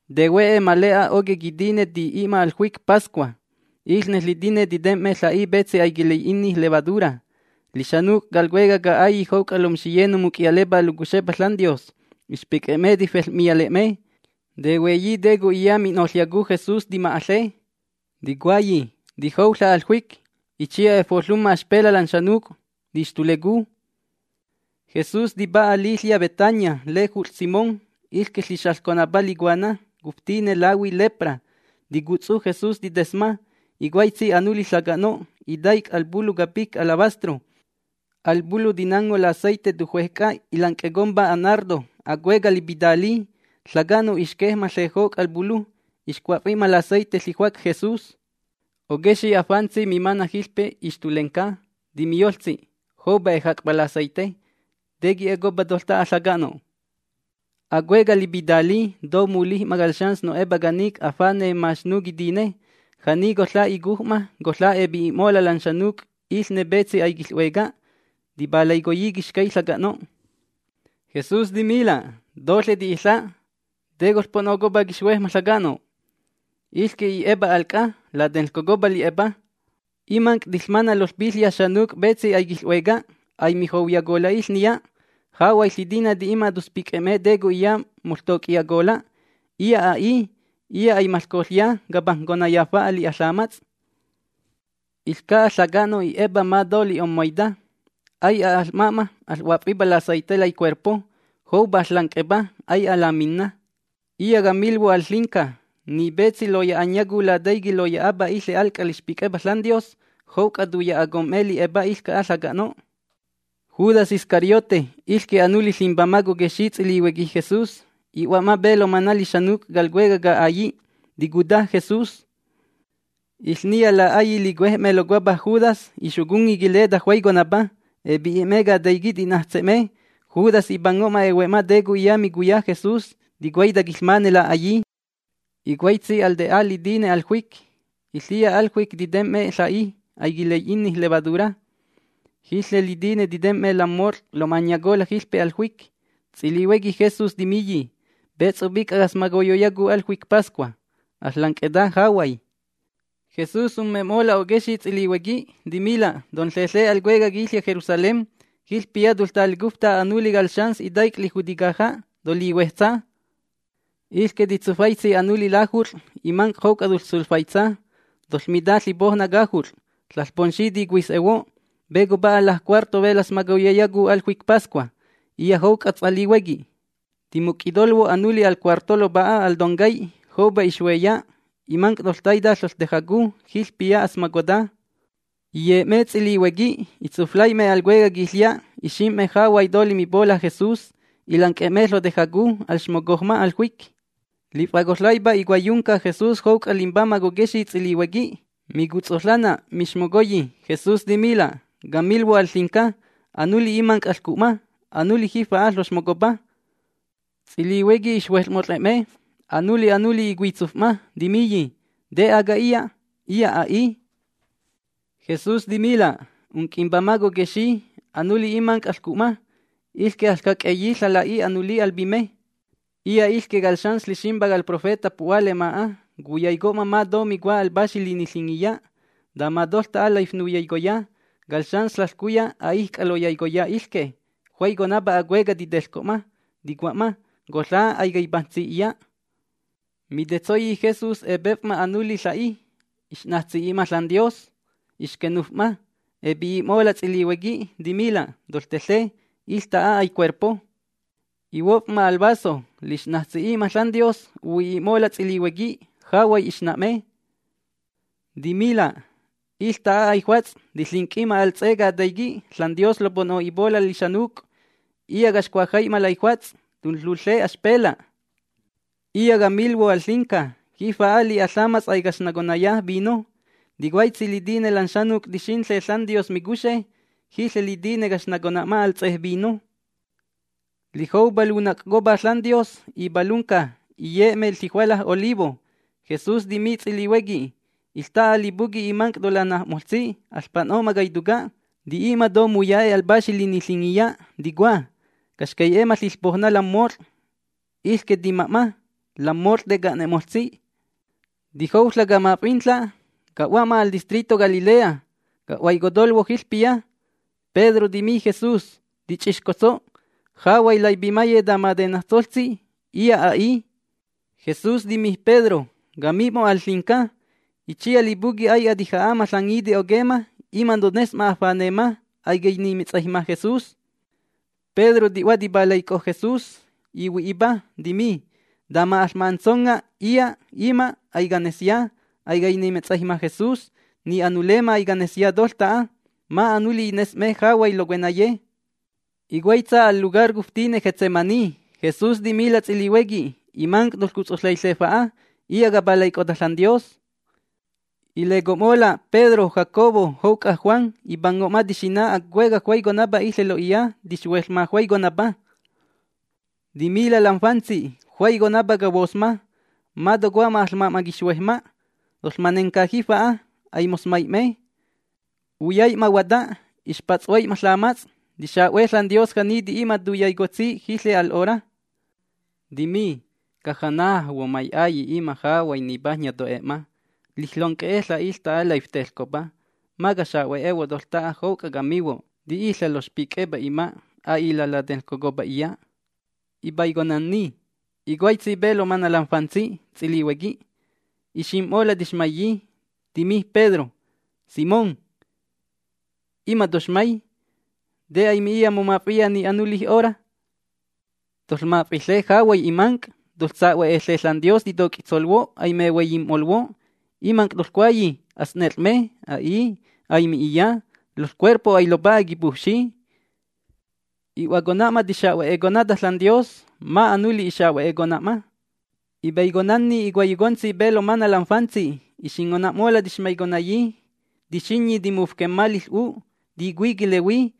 Tehue'e ma le'a oquej quitine ti'i'ma al juic Pascua. Iƚne ƚitiné titem'me ƚa'i petsi aiquilai'inni levadura. Lixanuc' cal cuecaj ca'ailli' jouc'a lomxiye nomuc'iyalepá locuxepa ȽanDios ixpic'e'me tifel'miyale'me. Tehueyi te co'iya mi'noƚyacu Jesús, tima'aƚe. Ticuayi: ―Tijouƚa' al juic. Itsiya efoƚumma axpela' lan xanuc', tixtulecu. Jesús tipa'a liƚya' Betania lejut'ƚ Simón, iƚque ƚixaƚconapa licuana cuftine lahui lepra. Ticutsu Jesús titesma. Icuaitsi anuli ƚaca'no' itaic' al pulu capic alabastro. Al pulu tinango laceite tujuej c'a ilanc'ecompa anardo, acueca' lipitali. Ƚaca'no' ixquej'ma ƚejoc' al pulu. Ixcua'fi'ma laceite ƚijuac Jesús. Oquexi' afantsi mimana' jiƚpe ixtulenca, timiyoƚtsi: ―Joupa ejac'pa laceite. ¿Te qui'ecopa toƚta'a ƚaca'no'? Acueca' lipitali, to mulij'ma cal xans no'epa canic' afane' maxnu quitine. Ja'ni coƚa' icuj'ma, coƚa' epi'i'mola' lan xanuc', iƚne petsi aiquiƚ'hueca. Tipalaicoyi quixcay ƚaca'no'. Jesús timila': ―Toƚe ti'iƚa'. ¿Te coƚpo'nocopa quixhuejma' ƚaca'no'? Iƚque i'epa al c'a. Latenƚcocopa li'epa. Imanc' tiƚmana' loƚpiƚya' xanuc' petsi aiquiƚ'hueca. Aimijouyacola' iƚniya. Jahuay ƚitiné ti'i'ma toƚspic'e'me te co'iya moƚtoc'iyacola'. Iya' a'i. Iya' aimaƚcoƚya capajnconaya fa'a li'a ƚamats'. Iƚca'a ƚaca'no' i'epa ma to li'ommaita. Ai'a aƚma'ma aƚ'huaf'impa laceite laicuerpo. Joupa aƚƚanc'epa ai'a laminna. Iya' camilhuo' al ƚinca: Ni petsi loya'anyacu Lataiqui' loya'apa iƚe al c'a lixpic'epa ȽanDios, jouc'a tuya'acom'me li'epa iƚca'a ƚaca'no'. Judas Iscariote, iƚque anuli limbamaj coquexi' ts'ilihuequi Jesús, i'hua'ma pe lomana' lixanuc' cal cuecaj ca'ailli', ticuta Jesús. Iƚniya la'aillí licuej'me locuapa Judas ixoconni quileta juaiconapa. Epi'i'me cataiqui' ti'najtse'me. Judas ipango'ma ehue'ma te co'iya micuya Jesús, ticuaita quiƚmane la'aillí. Icuaitsi al te'a litine al juic. Iƚiya al juic titem'me ƚa'i aiquilai'inni levadura. Jiƚe litine tite'me lam mot'ƚ loma'anyacola' jiƚpe al juic. Ts'ilihuequi Jesús timiyi: ―¿Pe ts'opic'a caƚsmocoyoyacu al juic Pascua? Aƚƚanc'eta jahuay. Jesús umme'mola' oquexi' ts'ilihuequi, timila': ―Tonƚeƚe al cueca' quiƚya' Jerusalén. Jiƚpiya toƚtalecufta anuli cal xans itaic' lijuti caja'. Tolihuejtsa. Iƚque titsufaitsi anuli lajut'ƚ, imanc' jouc'a toƚsuflaitsa. Toƚmita ƚipoujna cajut'ƚ: “ȽaƚPomxi ticuis'ehuo': ¿Pe copa'a lajcuarto pe laƚsmocoyoyacu al juic Pascua, iya' jouc'a ts'alihuequi?” Timuc'itolhuo' anuli al cuarto lopa'a al toncay, joupa ixhueya. Imanc' toƚtaita ƚaƚtejacu, jiƚpiya aƚsmocota. Iye'me ts'ilihuequi, itsuflai'me al cuecaj quiƚya', ixim'me jahuay to limipola' Jesús. Ilanc'e'me ƚotejacu alxmocojma al juic. Lif'acoƚaipa icuaiyunca Jesús jouc'a limbamaj coquexi' ts'ilihuequi. Micutsoƚanna, mixmocoyi, Jesús timila': ―Camilhuo' al ƚinca: Anuli imanc' aƚcuna'ma, anuli jifa'a ƚoxmocopa. Ts'ilihuequi ixhueƚmot'ƚe'me. Anuli anuli icuitsuf'ma, timiyi: ―¿Te aga iya'? Iya' a'i. Jesús timila': ―Unc'imbamaj coquexi' anuli imanc' aƚcu'ma. Iƚque aƚjac'eyi ƚala'i anuli al pime. Iya' iƚque cal Xans Ƚiximpa cal profeta pu'hua lema'a. Cuyaico'ma ma to micua al Paxi Liniƚingiya. Tama toƚta'a laifnuyaicoya, cal xans ƚaƚcuya a'ijc'a loyaicoya iƚque. Juaiconapa acueca' titeƚco'ma, ticua'ma: “Coƚa' aicaipajntsi iya'”. Mitetsoyi Jesús epef'ma anuli ƚa'i, ix'najtsi'i'ma ȽanDios, ixquenuf'ma. Epi'i'mola' ts'ilihuequi, timila': ―Toƚteƚe. Iƚta'a aicuerpo. Ihuof'ma al vaso. Lix'najtsi'i'ma ȽanDios, uhui'i'mola' ts'ilihuequi. Jahuay ixna'me. Timila': ―Iƚta'a aijuats', tiƚinc'i'ma al ts'e quitaiqui' ȽanDios lopo'no'ipola' lixanuc'. Iya' caxcuajai'ma laijuats' tunƚul―le axpela'. Iya' camilhuo' al ƚinca: Jifa'a li'a ƚamats' aicaxnaconaya vino. Ticuaitsi litine lan xanuc' tixinƚe ȽanDios micuxe, jiƚe litine caxnacona'ma al ts'e vino. Lijoupa lunac'copa ȽanDios ipalunca. Iye'me ƚijuala Olivo. Jesús timi ts'ilihuequi: ―Iƚta'a lipuqui' imanc' tolanaj'moƚtsi, aƚpo'no'ma caituca'. Ti'i'ma to muya'e' al Paxi Liniƚingiya, ticua: “Caxcai'e'ma ƚiƚpoujna lam mot'ƚ, iƚque tima'ma. Lam mot'ƚ teca'ne'moƚtsi.” Tijouƚa' camaf'inaƚa' ca'hua'ma al distrito Galilea. Ca'huaicotolhuo' jiƚpiya. Pedro timi Jesús: ―Tixtuc'otso' jahuay laipimaye, tama tenajtsoƚtsi, iya' a'i. Jesús timi Pedro: ―Cami'mo' al ƚinca: Itsiya lipuqui' ai'a tija'a'ma ƚangiti oquemma, ima' tones'ma afanemma: “Aicainimetsaijma Jesús”. Pedro ti'hua tipalaic'o Jesús, ihui'ipa, timi: ―Tama aƚma'atsonga' iya' ima', aicanesya: Aicainimetsaijma Jesús. Ni anulemma canesya toƚta'a. Ma' anuli ines'me jahuay locuenaye. Icuaitsa al lugar cuftine Getsemaní. Jesús timila' ts'ilihuequi: ―Imanc' toƚcutsoƚaiƚe fa'a. Iya' capalaic'ota ȽanDios. Ileco'mola' Pedro, Jacobo jouc'a Juan. Ipango'ma tixina acueca' juaiconapa iƚe lo'iya, tixhueƚma juaiconapa. Timila' lam fantsi: ―Juaiconapa cahuosma, ma tocomma aƚma'ma quixhuejma'. Toƚmanenca jifa'a. Aimoƚsmai'me. Uyai'ma huata, ixpats'huai'ma ƚamats'. Tixa'hue ȽanDios ja'ni ti'i'ma tuyaicotsi jiƚe al 'hora. Timi: ―Abba, mai'Ailli', ima' jahuay nipajnya to'e'ma. Liƚonc'e'eƚa' iƚta'a laifteƚcopa. Ma caxa'huehuo' toƚta'a jouc'a camihuo': Ti'iƚa' lofxpic'epa ima', a'i latenƚcocopa iya'. Ipaiconanni, icuaitsi pe lomana' lam fantsi ts'ilihuequi. Ixim'mola' tixmaiyi. Timi Pedro: ―Simón, ¿ima toxmay? ¿Te aimi'iya momaf'iya ni anulij hora? Toƚmaf'iƚe jahuay imanc'. Toƚsa'hueƚe ȽanDios titoc'itsolhuo' aimehuaiyim'moƚhuo'. Imanc' toƚcuayi: “Aƚsnet'ƚ'me”. A'i, aimi'iya. Loƚcuerpo ailopa'a quipujfxi. I'huacona'ma, tixa'hueconata ȽanDios. Ma' anuli ixahue'econa'ma. Ipaiconanni icuaiyocontsi pe lomana' lam fantsi, ixingona'mola' tixmaiconayi. Tixinyi timufquemma liƚ'u'. Ticui quilehui.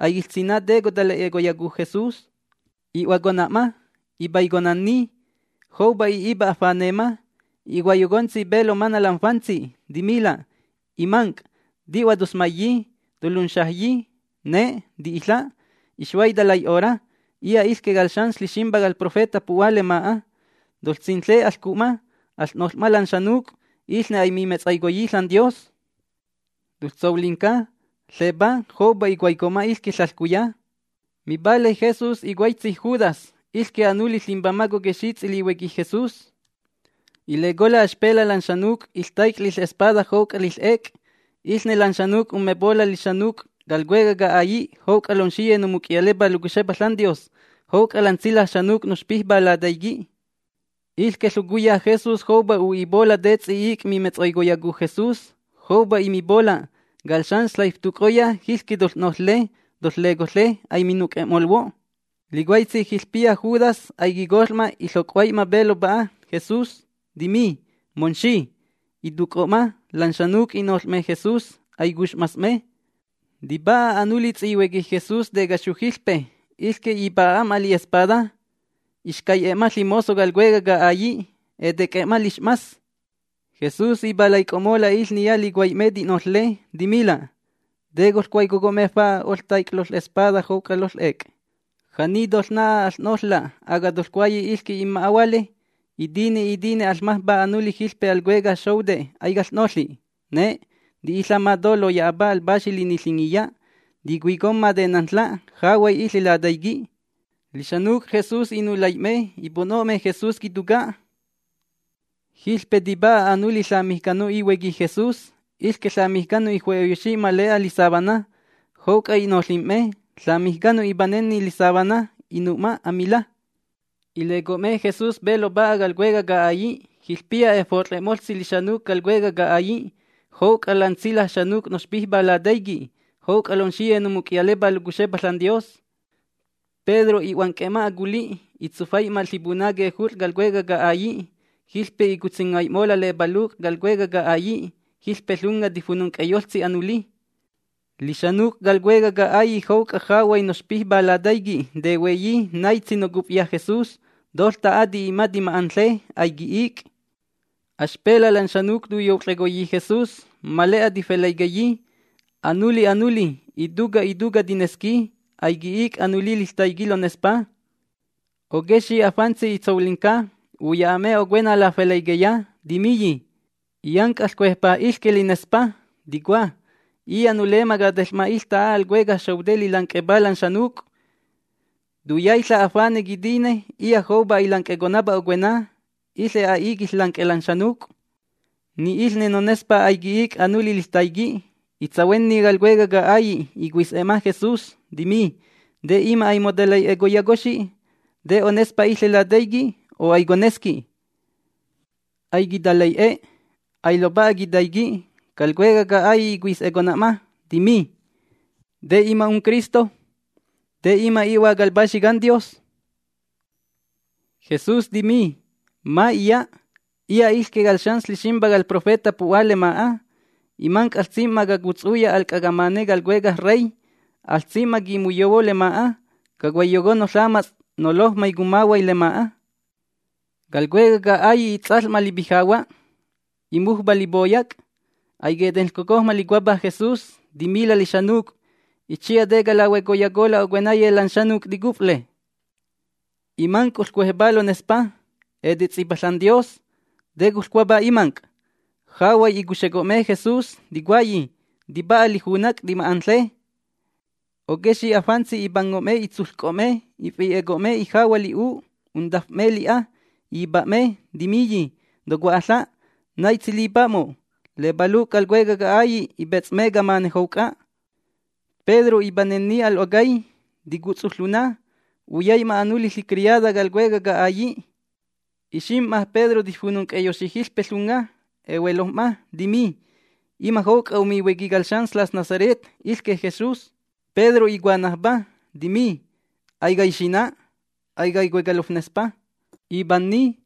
Aiquiƚsina' te cotalai'e'eyacu Jesús. I'huacona'ma. Ipaiconanni. Joupa i'ipa afanemma. Icuaiyocontsi pe lomana' lam fantsi. Timila': ―Imanc', ¿ti'hua toƚsmaiyi? ¿Tolunxajyi? Ne', ti'iƚa'. Ixhuaita lai'hora. Iya' iƚque cal Xans Ƚiximpa cal profeta pu'hua lema'a. ¡Toƚsinƚe! Aƚcu'ma. Aƚ'noƚ'ma lan xanuc', iƚne aimimetsaicoyi ȽanDios. ¡Toƚsolinca! ¡Ƚepá! Joupa icuaico'ma iƚquiya ƚaƚcuya. Mipalay Jesús icuaitsi Judas, iƚque anuli limbamaj coquexi' ts'ilihuequi Jesús. Ilecola' axpela' lan xanuc' iƚtaic' liƚ'espada jouc'a liƚ'ec. Iƚne lan xanuc' ummempola' lixanuc' cal cuecaj ca'ailli' jouc'a lomxiye nomuc'iyalepá locuxepa ȽanDios, jouc'a lan tsilaj xanuc' noxpijpá lataiqui'. Iƚque ƚocuya Jesús joupa u'ipola' te ts'i'ic' mimetsaicoyacu Jesús. Joupa imipola': “Cal xans ƚaiftuc'oya jiƚque toƚ'noƚƚe. Toƚƚecoƚe. Aiminuc'e'molhuo'.” Licuaitsi jiƚpiya Judas aiquicoƚ'ma iƚoc'huai'ma pe lopa'a Jesús, timi: ―¡Momxi! Ituc'o'ma. Lan xanuc' i'noƚ'me Jesús. Aicux'mas'me. Tipa'a anuli ts'ihuequi Jesús tecaxu jiƚpe. Iƚque ipa'a'ma li'espada, ixcai'e'ma ƚimozo cal cuecaj ca'ailli', etec'e'e'ma lix'mas. Jesús ipalaic'o'mola' iƚniya licuai'me ti'noƚƚe, timila': ―¿Te coƚcuaiyoco'me fa'a oƚtaic' loƚ'espada jouc'a lonƚ'ec? ¿Ja'ni toƚna'a aƚ'noƚƚa'? ¿Aga toƚcuayi: “Iƚque inma'ahuale”? Itine itine aƚmajmpá anuli jiƚpe al cuecaj xoute', aicaƚ'noƚi. Ne', ti'iƚa' ma to loya'apa al Paxi Liniƚingiya. Ticuicomma tenanƚƚa' jahuay iƚe lataiqui'. Lixanuc' Jesús inulai'me, ipo'no'me Jesús quituca'. Jiƚpe tipa'a anuli ƚamijcano ihuequi Jesús. Iƚque ƚamijcano iju'eyoxi ma le'a lisábana. Jouc'a i'noƚim'me. Ƚamijcano ipanenni lisábana, inu'ma amila. Ileco'me Jesús pe lopa'a cal cuecaj ca'ailli'. Jiƚpiya efot'ƚe'moƚtsi lixanuc' cal cuecaj ca'ailli' jouc'a lan tsilaj xanuc' noxpijpá lataiqui', jouc'a lomxiye nomuc'iyalepá locuxepa ȽanDios. Pedro i'huanc'e'ma aculi'. Itsufai'ma ƚipuna quejut'ƚ cal cuecaj ca'ailli'. Jiƚpe icutsingai'mola' lepaluc' cal cuecaj ca'ailli'. Jiƚpe ƚunga tifununc'eyoƚtsi anuli. Lixanuc' cal cuecaj ca'ailli' jouc'a jahuay noxpijpá lataiqui' tehueyi naitsi nocufya Jesús. Toƚta'a ti'i'ma tima'anƚe. Aiqui'ic'. Axpela' lan xanuc' tuyout'ƚecoyi Jesús, ma le'a tifelƚaiqueyi. Anuli anuli, ituca' ituca' tinesqui. Aiqui'ic' anuli liƚtaiqui' lonespa. Oquexi' afantsi itsolinca uya'a'me ocuena lafelƚaiqueya, timiyi: ―Illanc' aƚcuejpá iƚque linespa, ticua: “Iya' nulemma cateƚ'ma iƚta'a al cuecaj xoute' lilanc'epa lan xanuc'. Tuyaiƚa' afane' quitine iya' joupa ailanc'econapa ocuena. Iƚe a'i quiƚƚanc'e'e lan xanuc'.” Ni iƚne nonespá aiqui'ic' anuli liƚtaiqui'. Itsahuenni cal cuecaj ca'ailli', icuis'e'ma Jesús, timi: ―¿Te ima' aimotalai'ecoyacoxi? ¿Te onespa iƚe lataiqui', o aiconesqui? Aiquitalai'e. Ailopa'a quitaiqui'. Cal cuecaj ca'ailli' icuis'econa'ma, timi: ―¿Te ima' unCristo? ¿Te ima' i'Hua cal Paxi CanDios? Jesús timi: ―Ma' iya'. Iya' iƚque cal Xans Ƚiximpa cal profeta pu'hua lema'a. Imanc' aƚsim'ma cacutsuya al c'a camane cal Cuecaj Rey. Aƚsim'ma quimuyohuo lema'a, cacuaiyoconno ƚamats' nolojmay cummahuay lema'a. Cal cuecaj ca'ailli its'aƚ'ma lipijahua', imujpa lipoyac'. Aiquetenƚcocojma locuapa Jesús. Timila' lixanuc': ―Itsiya, ¿te calahuecoyacola' ocuenaye lan xanuc' ticufle? Imanc' oƚcuejpá lonespa. Etets'ipa ȽanDios. ¿Te coƚcuapa imanc'? Jahuay icuxeco'me Jesús, ticuayi: ―Tipa'a lijunac'. ¡Tima'anƚe! Oquexi' afantsi ipango'me itsuƚco'me, ifi'e'eco'me ijahua' li'u', untaf'me li'a, ipa'me, timiyi: ―Tocua'aƚa', ¿naitsi lipa'mo'? Lepaluc' cal cuecaj ca'ailli' ipets'me camane jouc'a. Pedro ipanenni al 'ocay, ticutsu ƚuna. Uyai'ma anuli ƚicriada cal cuecaj ca'ailli'. Ixim'ma Pedro tifununc'eyoxi jiƚpe ƚunga. Ehuelojm'ma, timi: ―Ima' jouc'a omihuequi cal xans ƚas Nazaret, iƚque Jesús. Pedro icuanajpa, timi: ―Aicaixina'. Aicaicueca lofnespa. Ipanni,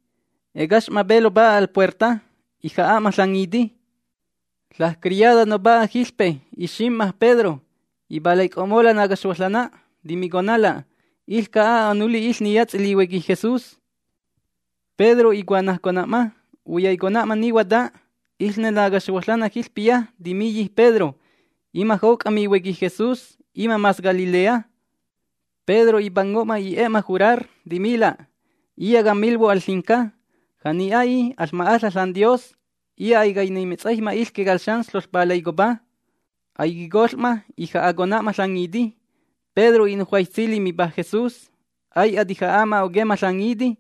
ecax'ma pe lopa'a al puerta. Ija'a'ma ƚangiti. Ƚajcriada nopa'a jiƚpe ixim'ma Pedro. Ipalaic'o'mola' nacaxhuoƚanna, timiconala': ―Iƚca'a anuli iƚniya ts'ilihuequi Jesús. Pedro icuanajcona'ma. Uyai'ma ni huata, iƚne nacaxhuoƚanna jiƚpiya timiyi Pedro: ―Ima' jouc'a mihuequi Jesús. Ima' mas Galilea. Pedro ipango'ma i'e'ma jurar, timila': ―Iya' camilhuo' al ƚinca. Ja'ni a'i, ¡aƚma'aƚa' ȽanDios! Iya' aicainimetsaijma iƚque cal xans ƚoƚpalaicopa. Aiquicoƚ'ma, ija'acona'ma ƚangiti. Pedro i'nujuaitsi limipa Jesús: “Ai'a tija'a'ma oquemma ƚangiti,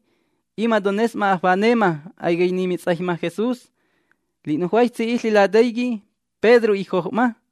ima' tones'ma afanemma: Aicainimetsaijma Jesús.” Li'nujuaitsi iƚe lataiqui' Pedro ijoj'ma.